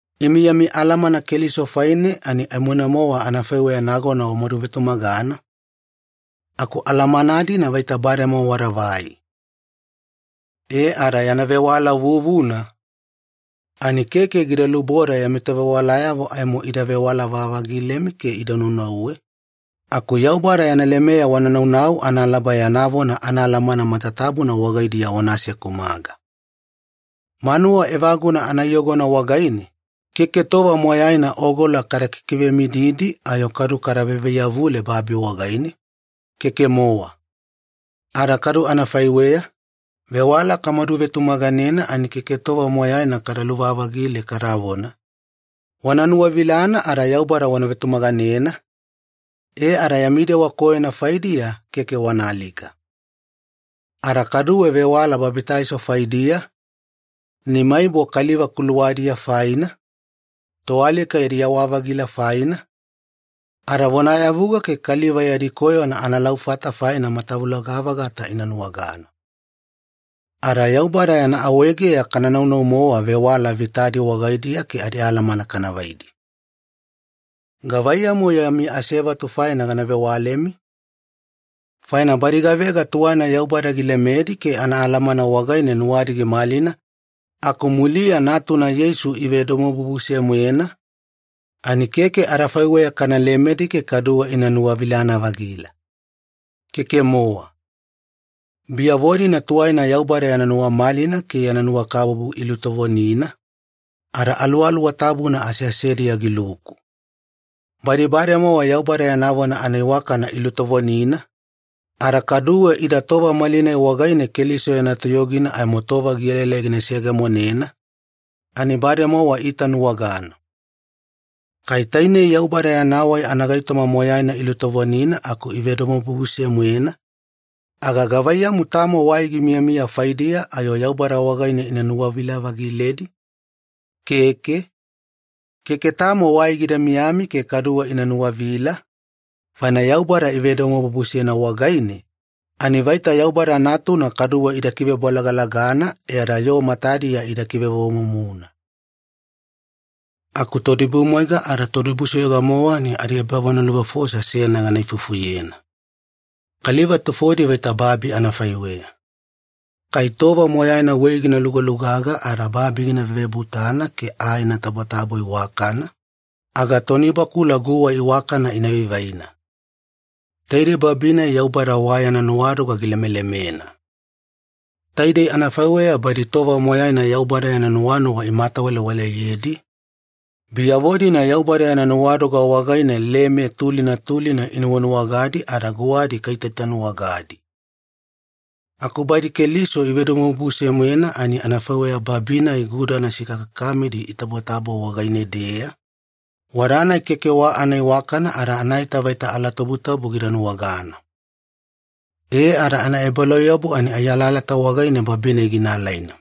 Imi yami alamana Keliso faine ani aimoina-mowa anafaiweya nagona wamaduvetumagana, aku alamana-dina vaita bademowa wadavai. E ada yana vewala vuvuna, ani keke gida luboda yami tovewalayavo aimo ida vewala-vavagilemi ke ida nunauwe, aku Yaubada yana lemeya wana naunau analaba yana vona anaalamana matatabuna wagaidiya wana asekumaga. Manuwa evaguna anaiyogona wagaine, keke tova moyaina ogola kada kikivemididi ayo kadu kada vaivaiyavuledi babi wagaine, keke-mowa. Ada kadu anafaiweya, vewala kamadu vetumaganena ani keke tova moyaina kada luvavagile kadavona, “Wana nuwavilana ada Yaubada wana vetumaganena, e ada yami dewa koyona faidiya keke wana alika.” Ada kaduwe vewala babitaiso faidiya, nimaibo kaliva kuluwadiya faina, toalika yadi yawa-vagila faina, ada vonayavuga ke kaliva yadi koyona analaufata faina matavuloga-vagata ina nuwagana. Ada Yaubada yana awaegeya kananau-mowa vewala vitadi wagaidiya ke adialamana kana vaidi. Gavaiyamu-yo yami veasevatu faina gana vewalemi? Faina badi gavega tuwaina Yaubada gilemedi ke anaalamana wagaine nuwadi gimalina aku muliya Natuna Yeisu ivedomobubuse-moena, ani keke adafaiweya kana lemedi ke kaduwe ina nuwavilana-vagila, keke-mowa. Biyavo-dina tuwaina Yaubada yana nuwamalina ke yana nuwakabubu ilutovonina, ada Aluwaluwa Tabuna aseasediya giluku. Badi bademowa Yaubada yana vona anaiwakana ilutovonina, ada kaduwe ida tova malinai wagaine Keliso yana toyogina aimo tova gielaelai gina seyegemonena, ani bademowa iitanuwagana. Kai tainei Yaubada yana wai anagaitoma moyaina ilutovonina aku ivedomobubuse-moena, aga gavaiyamu tamo wai gimiyamiya faidiya ayo Yaubada wagaine ina nuwavila-vagiledi? Keke, keke tamo wai gida miyami ke kaduwe ina nuwavila, faina Yaubada ivedomobubusena wagaine, ani vaita Yaubada Natuna kaduwe ida kivebolagalagana e ada yoo matadiya ida kivevovomumuna. Aku toidibumwaiga ada todibusoyoga-mowa ani adiebavonaluvefosa seyana gana ifufuyena. Kaliva tufodi vaita babi anafaiweya. Kai tova moyaina wei gina lugalugaga ada babi gina vevebutana ke aa ina tabotabo iwakana, aga tonibakula guwa iwakana ina vaivaina. Taidei babi-nai Yaubada wa yana nuwadoga gilemelemena. Taidei anafaiweya badi tova moyaina Yaubada yana nuwanuwa imatawalewaleyedi, biyavo-dina Yaubada yana nuwadoga wagaine leme tulina tulina inunuwagadi ada guwadi kaitaitanuwagadi. Aku badi Keliso ivedomobubuse-moena ani anafaiweya babi-nai gudana sikakakamidi itabotabo wagaine-deya, wada-nai keke wa anaiwakana ada anaita vaita alatabutabu gida nuwagana. E ada anaebalauyabu ani ai alalata wagaine babi-nai gina alaina.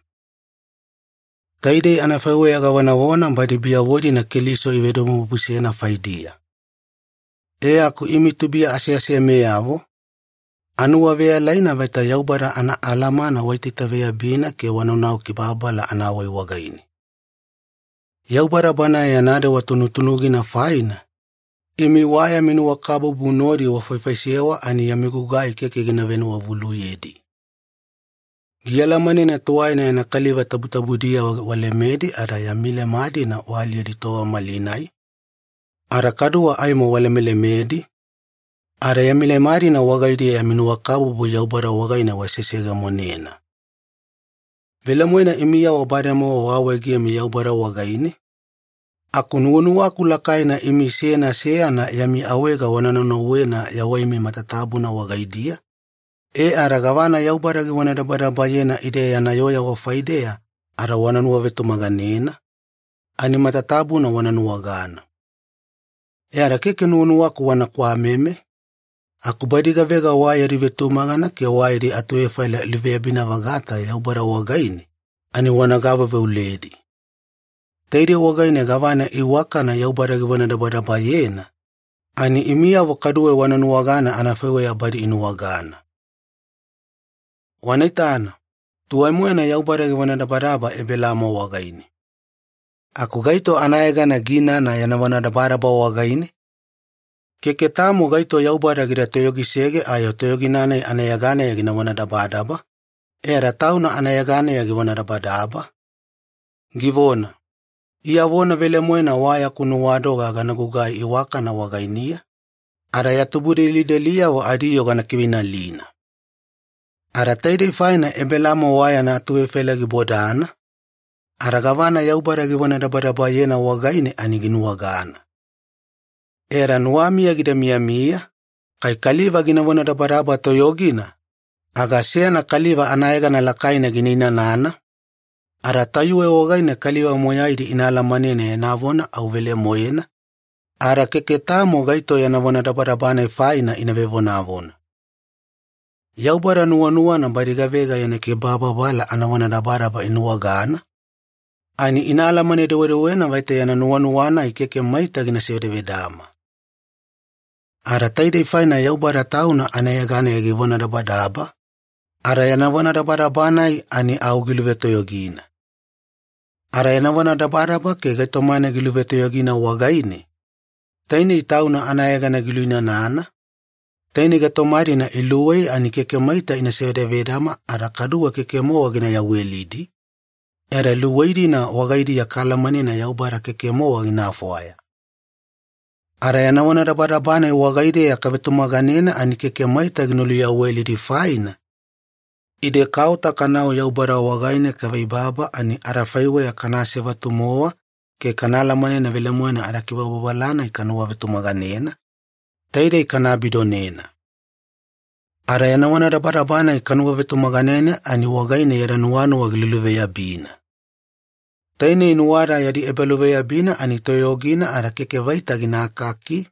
Taidei anafaiweya gavonavona badi biyavo-dina Keliso ivedomobubusena faidiya. E aku imi tubuiya aseasemeyavo, anuwaveyalaina vaita Yaubada anaalamana waitaitaveyabina ke wanaunau kibababala anawai wagaine. Yaubada Banae yana dewa tunutunugina faina, imi wa yami nuwakabubu nodi wafaifaisewa ani yami gugai keke gina venuwavuluyedi. Gialamanena tuwaina yana kaliva tabutabudiyavo walemedi ada yami leme-dina waaliyedi tova malinai, ada kaduwe aimo walemelemedi, ada yami leme-dina wagaidiya yami nuwakabubu Yaubada wagaine waseseyegemonena. Velemoena imiyavo bademowa waawaegemi Yaubada wagaine, aku nuwanuwaku lakaina ani imi seyana seyana yami awaega wana naunauwena yawaimi matatabuna wagaidiya, e ada gavana Yaubada givonadabadabayena ide yana yooyavo faideya ada wanuwavetumaganena, ani matatabuna wana nuwagana. E ada keke nuwanuwaku wana kwameme, aku badi gavega wa yadi vetumagana ke wa yadi atuvefaila iluveyabina-vagata Yaubada wagaine, ani wana gaveuveuledi. Taidei wagaine gavana iwakana Yaubada givonadabadabayena, ani imiyavo kaduwe wana nuwagana anafaiweya badi inuwagana. Wana itana, tuwai-moena Yaubada givonadabadaba Ebelaamo wagaine. Aku gaito anayegana giinana yana vonadabadaba wagaine? Keke tamo gaito Yaubada gida toyogisege ayo totoyogina-nai anayeganeya gina vonadabadaba, e ada Tauna anayeganeya givonadabadaba, givona, “Iya vona velemoena wa yaku nuwadoga gana gugai iwakana wagainiya, ada ya tubudelideliyavo adiyoo gana kiveinalina.” Ada taidei faina Ebelaamo wa yana atuvefaila gibodana, ada gavana Yaubada givonadabadabayena wagaine ani ginuwagana. E ada nuwamiya gida miyamiya, kai kaliva gina vonadabadaba toyogina, aga seyana kaliva anayegana lakaina gina inanana, ada tayuwe wagaine kaliva moyaidi ina alamanena yana vona au velemoena, ada keke tamo gaito yana vonadabadaba-nai faina ina vevonavona. Yaubada nuwanuwana badi gavega yana kibababala anavonadabadaba ina nuwagana, ani ina alamane-dewedewena vaita yana nuwanuwa-nai keke maita gina sivedavedama. Ada taidei faina Yaubada Tauna anayeganeya givonadabadaba, ada yana vonadabadaba-nai ani au giluvetoyogina. Ada yana vonadabadaba ke gaitoma-nai giluvetoyogina wagaine, tainei Tauna anayegana giluinanana, tainei gaitoma-dina iluwei ani keke maita ina sivedavedama ada kaduwe keke-mowa gina yawelidi, e ada luwei-dina wagaidiya kaalamanena Yaubada keke-mowa gina fwaya. Ada yana vonadabadaba-nai wagaideya kavetumaganena ani keke maita gina luyawelidi faina, ide kaota kanau Yaubada wagaine kaveibaba ani adafaiweya kana asevatu-mowa ke kana alamanena velemoena adakibababala-nai kanuwavetumaganena, taidei kana abidonena. Ada yana vonadabadaba-nai kanuwavetumaganena ani wagaine yada nuwanuwa giluluveyabina. Tainei nuwada yadi ebaluveyabina ani toyogina ada keke vaita gina akaki,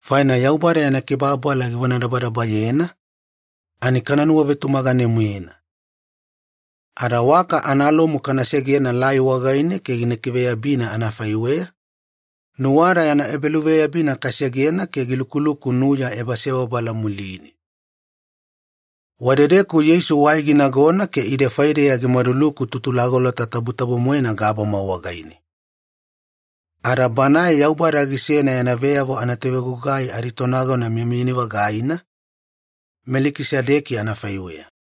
faina Yaubada yana kibababala givonadabadabayena, ani kana nuwavetumagane-moena. Ada waka analomu kana segena lai wagaine ke gikiveyabina anafaiweya, nuwada yana ebaluveyabina kasegena ke gilukuluku nuya ebasebabala muline. Wadedeku Yeisu wai ginagona ke ide faideya gimaduluku Tutulagolota Tabutabu-moena gabama wagaine. Ada Banae Yaubada gisena yana veyavo anatovegugai aditonagona miyamiyani-vagaina, Melikisedeki anafaiweya.